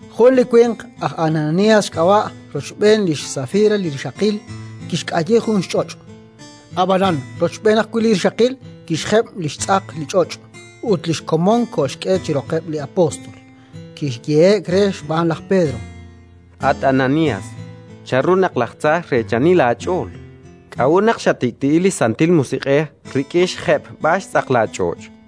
Jun li winq, aj Ananías xk'ab'a', rochb'een lix Safira li rixaqil, kixk'ayi jun xch'och', ab'anan, rochb'een ajwi' li rixaqil, kixjeb' li xtz'aq li ch'och' ut li xkomon kolxk'e chi roqeb' li apóstol. Kiyehe'k re xb'aan laj Pedro: —At Ananías, chanru naq laj tza xreechani laach'ool? K'a'ut naq xatik'ti'i li Santil Musiq'ej rik'in xjeb'b'al xtz'aq laach'och'?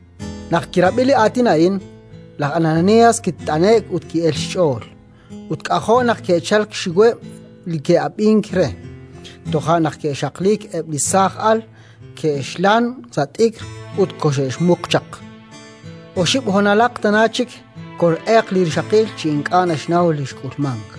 Naq kirab'i li aatin a'in, laj Ananías kit'ane'k ut ki'elk xch'ool. Ut k'ajo' naq ke'chalk xxiweb' li ke'ab'ink re. Toja' naq ke'xaqliik eb' li saaj al, ke'xlan sa' t'ikr ut koxe'xmuq chaq. Oxib' honalaq tana chik, kol'elq li rixaqil chi ink'a' naxnaw li xk'ulmank.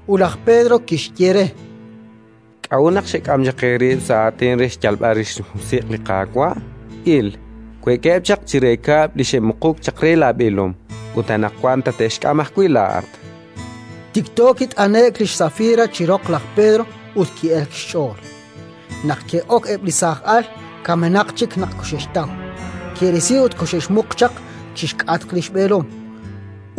Ut laj Pedro kixye re: —K'a'ut naq xek'am chaq eerib' sa' aatin re xyalb'al rix li xMusiq' li Qaawa'? Il, we'keb' chaq chire kab'l li xe'muquk chaq re laab'eelom; ut anaqwan tate'xk'am ajwi' laa'at. Tikto kit'ane'k lix Safira chi roq laj Pedro ut ki'elk xch'ool. Naq ke'ok eb' li saaj al, kamenaq chik naq koxe'xtaw; ke'risi ut koxe'xmuq chaq chi xk'atq li xb'eelom.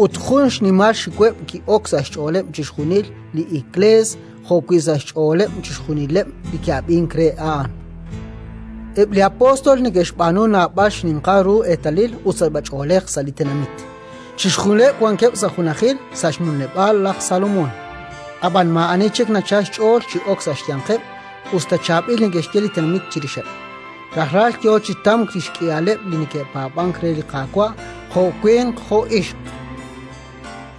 Ut jun xnimal xxiweb' ki'ok sa' xch'ooleb' chixjunil li Iklees jo'wi' sa' xch'ooleb' chixjunileb' li ke'ab'ink re a'an. Eb' li apóstol neke'xb'aanu naab'al xninqal ru eetalil ut sachb'ach'oolej sa' li tenamit. Chixjunileb' wankeb' sa' junajil sa' li xnumleb'aal laj Salomón, ab'an maa'ani chik nachalk xch'ool chi ok sa' xyanqeb', us ta chaab'il neke'xye li tenamit chirixeb'. Rajlal yo chi tamk li xk'ihaleb' li neke'paab'ank re li Qaawa', jo' winq jo' ixq: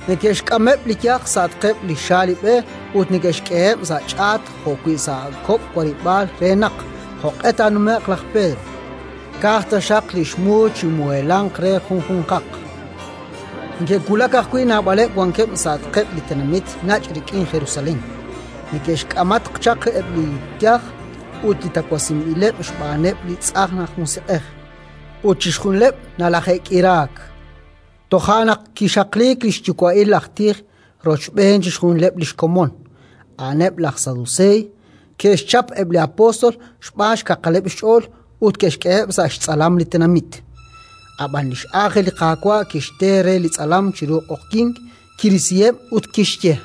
neke'xk'ameb' li yaj sa'atqeb' li xaalib'e ut neke'xk'eheb' sa' ch'aat jo'wi' sa' kok' warib'aal re naq, jo'q'e taanume'q laj Pedro, ka'aj taxaq li xmu chimuheelanq re junjunqaq. Neke'wulak ajwi' naab'aleb' wankeb' sa'atqeb' li tenamit nach' rik'in Jerusalén: neke'xk'amatq chaq eb' li xyaj ut li tawasinb'ileb' xb'aaneb' li tz'ajn aj musiq'ej, ut chixjunileb' nalaje'k'iraak. Toja' naq kixaqliik li xyuwa'il aj tij rochb'een chixjunileb' li xkomon, a'aneb' laj Saduseey, ke'xchap eb' li apóstol xb'aan xkaqaleb' xch'ool ut ke'xk'eheb' sa' xtz'alam li tenamit. Ab'an li x'angel li Qaawa' kixte re li tz'alam chiru q'oqyink, kirisiheb' ut kixye: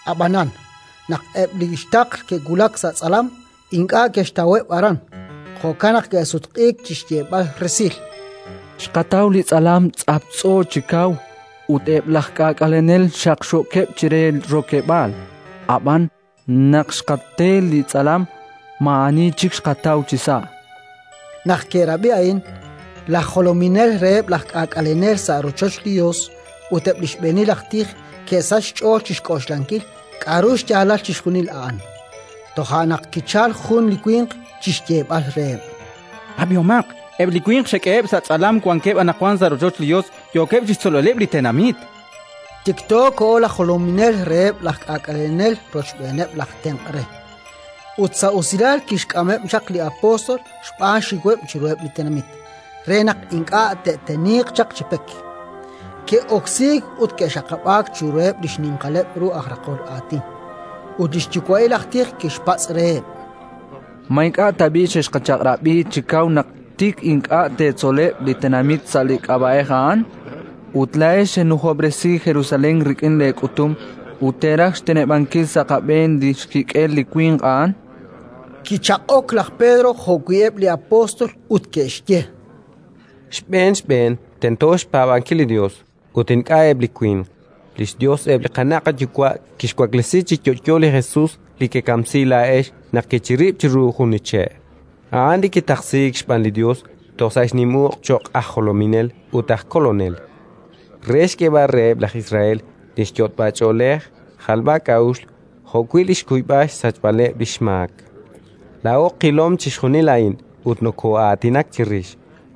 Ab'anan, naq eb' li xtaql ke'wulak sa' tz'alam, ink'a' ke'xtaweb' aran; jo'kan naq ke'sutq'iik chi xyeeb'al resil: —Xqataw li tz'alam tz'aptz'o chi kaw ut eb' laj k'aak'alenel xaqxookeb' chire rokeb'aal; ab'an, naq xqate li tz'alam, maa'ani chik xqataw chisa', chankeb'. Naq ke'rab'i a'in, laj jolominel reheb' laj k'aak'alenel sa' rochoch li Yos ut eb' li xb'eenil aj tij ke'sachk xch'ool chi xk'oxlankil k'aru xyaalal chixjunil a'an. Toja' naq kichalk jun li winq chi xyeeb'al reheb': —Ab'ihomaq: eb' li winq xek'eheb' sa' tz'alam wankeb' anaqwan sa' rochoch li Yos, yookeb' chi xtzolb'aleb' li tenamit. Tikto koho laj jolominel reheb' laj k'aak'alenel rochb'eeneb' laj tenq' re, ut sa' usilal kixk'ameb' chaq li apóstol xb'aan xxiweb' chiruheb' li tenamit, re naq ink'a' te'teniiq chaq chi pek. Ke'oksiik ut ke'xaqab'aak chiruheb' li xninqaleb' ru aj raqol aatin. Ut li xyuwa'il aj tij kixpatz' reheb': —Ma ink'a' tab'i' xexqachaq'rab'i chi kaw naq tik ink'a' teetzoleb' li tenamit sa' li k'ab'a'ej a'an? Ut laa'ex xenujob'resi Jerusalén rik'in leek'utum ut teeraj xteneb'ankil sa' qab'een li xkik'el li winq a'an, chan reheb'. Kichaq'ok laj Pedro jo'wi' eb' li apóstol, ut ke'xye: —Xb'een xb'een tento xpaab'ankil li Yos, ut ink'a' eb' li winq. Li xYos eb' li qana' qayuwa' kixwaklesi chi yo'yo li Jesus li kekamsi laa'ex naq kechirib' chiru jun che'. A'an li kitaqsiik xb'aan li Yos toj sa' xnim uq' cho'q aj jolominel ut aj kolonel, re xk'eeb'al reheb' laj Israel li yot'b'ach'oolej jalb'ak'a'uxl jo'wi' li xkuyb'al xsachb'aleb' li xmaak. Laa'o qilom chixjunil a'in ut nokoo'aatinak chirix;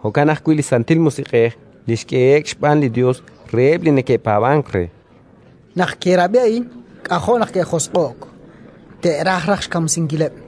jo'kan ajwi' li Santil Musiq'ej li xk'ehe'k xb'aan li Yos reheb' li neke'paab'ank re. Naq ke'rab'i a'in, k'ajo' naq ke'josq'o'k, te'raj raj xkamsinkileb'.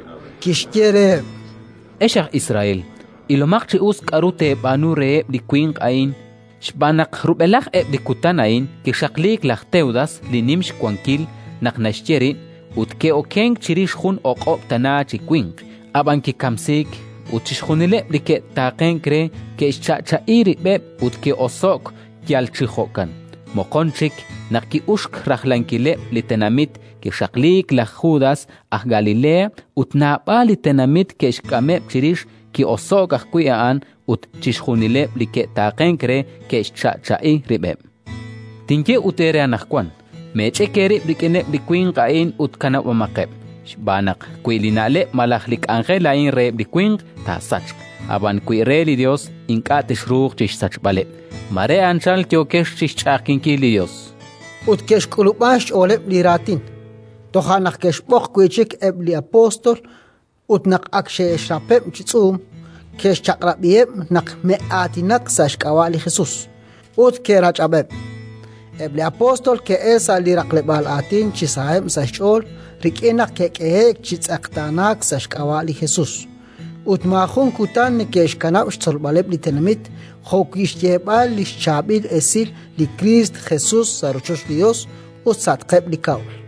kixye reheb': —Ex aj Israel, ilomaq chi us k'aru teeb'aanu reheb' li winq a'in. Xb'aan naq rub'elaj eb' li kutan a'in kixaqliik laj Tewdas li nim xwankil naq naxye rib', ut ke'okenk chirix jun o'q'ob' tana chi winq. Ab'an kikamsiik, ut chixjunileb' li ke'taaqenk re ke'xcha'cha'i rib'eb' ut ke'oso'k yal chi jo'kan. Moqon chik, naq ki'uxk rajlankileb' li tenamit, kixaqliik laj Judas aj Galilea ut naab'al li tenamit kixk'ameb' chirix. Ki'oso'k ajwi' a'an, ut chixjunileb' li ke'taaqenk re ke'xcha'cha'i rib'eb'. Tinye ut eere anaqwan: Meech'ik eerib' rik'ineb' li winq a'in ut kanab'omaqeb'. Xb'aan naq, wi li na'leb' malaj li k'anjel a'in reheb' li winq, taasachq; ab'an wi re li Yos, ink'a' texruuq chi xsachb'aleb'. Mare anchal yookex chi xch'a'ajkinkil li Yos. Ut ke'xk'ulub'an xch'ooleb' li raatin. Toja' naq ke'xb'oq wi' chik eb' li apóstol ut naq ak xe'xrapeb' chi tz'uum, ke'xchaq'rab'iheb' naq me'aatinak sa' xk'ab'a' li Jesus. Ut ke'rach'ab'eb'. Eb' li apóstol ke'elk sa' li raqleb'aal aatin chi saheb' sa' xch'ool rik'in naq ke'k'ehe'k chi tz'eqtaanaak sa' xk'ab'a' li Jesus. Ut maajun kutan neke'xkanab' xtzolb'aleb' li tenamit jo'wi' xyeeb'al li xChaab'il Esil li Kristo Jesus sa' rochoch li Yos ut sa'atqeb' li kab'l.